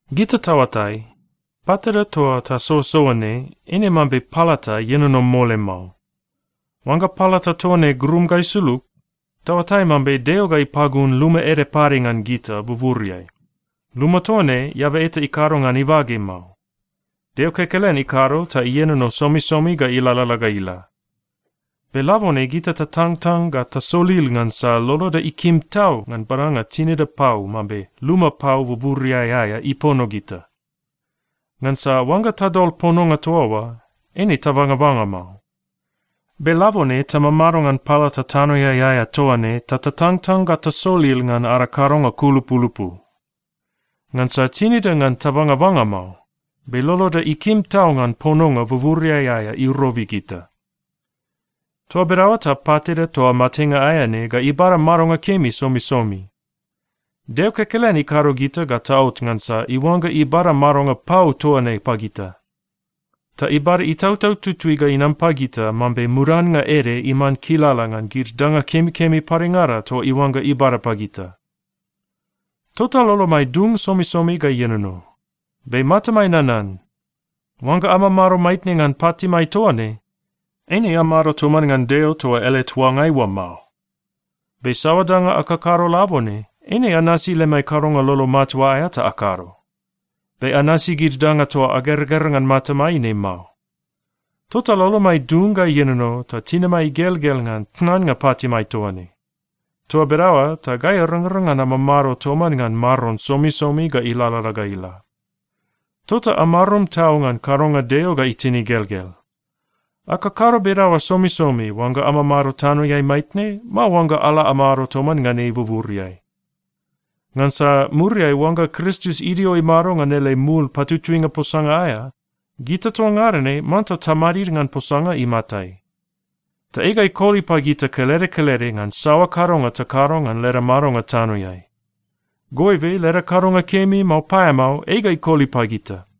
Gita taoatai, patida toa tasoasoa ne, eine mambe palata ienono mole mao. Oangga palata toa ne grum ga isulug, taoatai mambe Deo ga ipagun luma ede pade ngan gita buburiai. Luma toa ne, eaba eta ikado ngan ibage mao. Deo kekelen ikado ta ienono somisomi ga ilalala ga ila. Be labone gita tatangtang ga tasolil ngansa loloda ikim tau ngan badanga tinida pau mambe luma pau buburiai aea ipono gita. Ngansa oangga tadol pononga toa oa, eine tabangabanga mao. Be labone tamamado ngan palata tanoeai aea toa ne ta tatangtang ga tasolil ngan ada kadonga kulupulupu. Ngansa tinida ngan tabangabanga mao. Be loloda ikim tau ngan pononga buburiai aea irobi gita. Toa bedaoa ta patida toa matenga aea ne ga ibada madonga kemi somisomi. Deo kekelen ikado gita ga taot ngansa iuangga ibada madonga pau toa ne pagita. Ta ibada Itautau Tutui ga inam pagita mambe mudannga ede iman kilala ngan gid danga kemikemi padengada toa iuangga ibada pagita. Tota lolomai dung somisomi ga ienono. Be matamai nanan, oangga amamado maitne ngan patimai toa ne, eine amado toman ngan Deo toa ele tuangai oa mao. Be saoa danga akakado labone, eine anasi lemai kadonga lolo matua aea ta akado. Be anasi gid danga toa ageragera ngan matamai ne mao. Tota lolomai dung ga ienono ta tinimai igelgel ngan tnannga patimai toa ne. Toa bedaoa ta gai arangrang ngan amamado toman ngan Maron somisomi ga ilalala ga ila. Tota amarum tau ngan kadonga Deo ga itin igelgel. Akakado bedaoa somisomi, oangga amamado tanoeai maitne, mao oangga ala amado toman ngan ei buburiai. Ngansa muriai oangga Kristus idio imado ngan ele mul patutuinga posanga aea, gita toa ngada ne manta tamadid ngan posanga imatai. Ta ei ga ikoli pagita kelede kelede ngan saoa kadonga takado ngan leda madonga tanoeai. Goibe leda kadonga kemi, mao paeamao, ei ga ikoli pagita.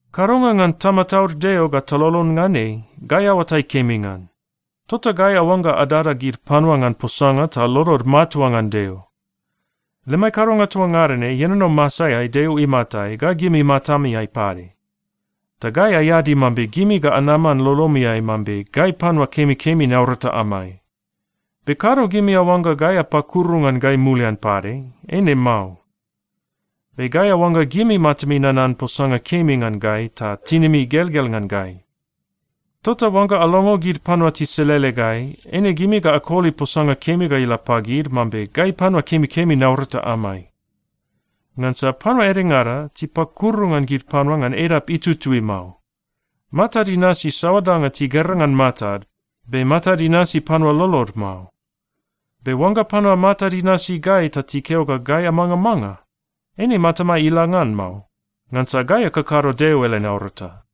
Kadonga ngan tamataud Deo ga talolon ngan ei, gai aoatai kemi ngan. Tota gai aoangga adada gid panua ngan posanga ta lolod matua ngan Deo. Lemai kadonga toa ngada ne ienono masaeai Deo imatai ga gimi matamiai pade. Ta gai aeadi mambe gimi ga anaman lolomiai mambe gai panua kemikemi naurata amai. Be kado gimi aoangga gai apakuru ngan gai mulian pade. Eine mao. Be gai aoangga gimi matami nanan posanga kemi ngan gai ta tinimi igelgel ngan gai. Tota oangga alongo gid panua tiselele gai, eine gimi ga akoli posanga kemi ga ila pagid mambe gai panua kemikemi naurata amai. Ngansa panua edengada tipakuru ngan gid panua ngan edap itutui mao. Matad inasi saoa danga tigera ngan matad, be matad inasi panua lolod mao. Be oangga panua matad inasi gai ta tikeo ga gai amangamanga, eine matamai ila ngan mao. Ngansa gai akakado Deo ele naurata.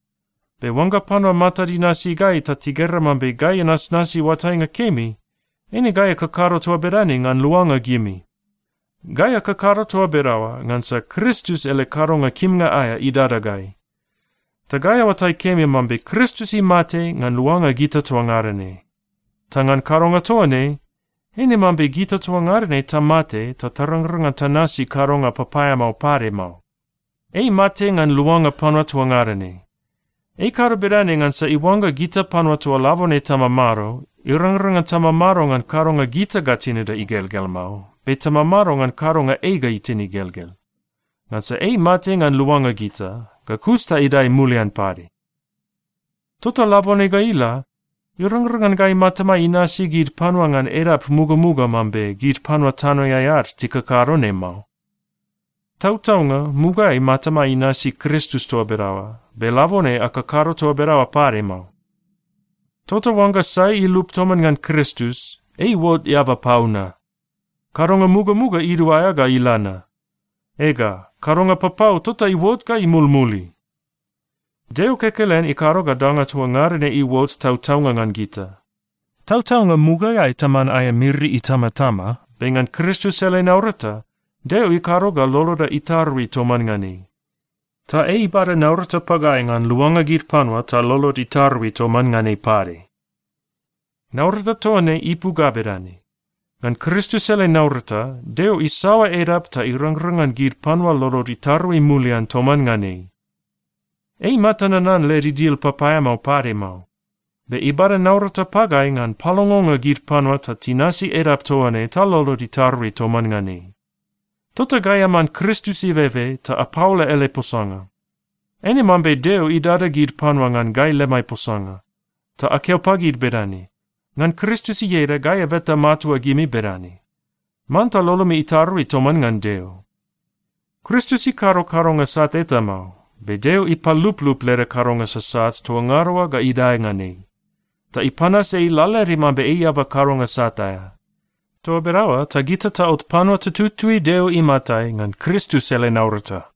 Be oangga panua matad inasi gai ta tigera mambe gai anasnasi oatainga kemi, eine gai akakado toa bedane ngan luanga gimi. Gai akakado toa bedaoa ngansa Kristus ele kadonga kimnga aea idada gai. Ta gai aoatai kemi mambe Kristus imate ngan luanga gita toa ngada ne. Ta ngan kadonga toa ne, eine mambe gita toa ngada ne tamate ta tarangrang ngan tanasi kadonga papaeamao pade mao. Ei imate ngan luanga panua toa ngada ne. Ei ikado bedane ngansa iuangga gita panua toa labone tamamado, irangrang ngan tamamado ngan kadonga gita ga tinida igelgel mao, be tamamado ngan kadonga ei ga itin igelgel. Ngansa ei imate ngan luanga gita, ga kus ta idae mulian pade. Tota labone ga ila, irangrang ngan gai matamai inasi gid panua ngan edap mugamuga mambe gid panua tanoeai ad tikakado ne mao. Tautaunga mugaeai matamai inasi Kristus toa bedaoa, be labone akakado toa bedaoa pade mao. Tota oangga sai ilup toman ngan Kristus, ei iuot eaba pau na. Kadonga mugamuga iduaea ga ila na. Ega, kadonga papau tota iuot ga imulmuli! Deo kekelen ikado ga danga toa ngada ne iuot tautaunga ngan gita. Tautaunga, mugaeai taman aea miri itamatama. Be ngan Kristus ele naurata, Deo ikado ga loloda itarui toman ngan ei. Ta ei ibada naurata pagai ngan luanga gid panua ta lolod itarui toman ngan ei pade. Naurata toa ne ipu ga bedane: Ngan Kristus ele naurata, Deo isaoa edap ta irangrang ngan gid panua lolod itarui mulian toman ngan ei. Ei imata nanan led idil papaeamao pade mao. Be ibada naurata pagai ngan palongonga gid panua ta tinasi edap toa ne ta lolod itarui toman ngan ei. Tota gai aman Kristus ibebe ta apaola ele posanga. Eine mambe Deo idada gid panua ngan gai lemai posanga. Ta akeo pagid bedane, “Ngan Kristus ieda, gai abeta matua gimi bedane: Manta lolomi itarui toman ngan Deo!” Kristus ikado kadonga sat eta mao, be Deo ipaluplup leda kadonga sasat toa ngada oa ga idae ngan ei, ta ipanas ei lalaede mambe ei eaba kadonga sat aea. Toa bedaoa ta gita taot panua tututui Deo imatai ngan Kristus ele naurata.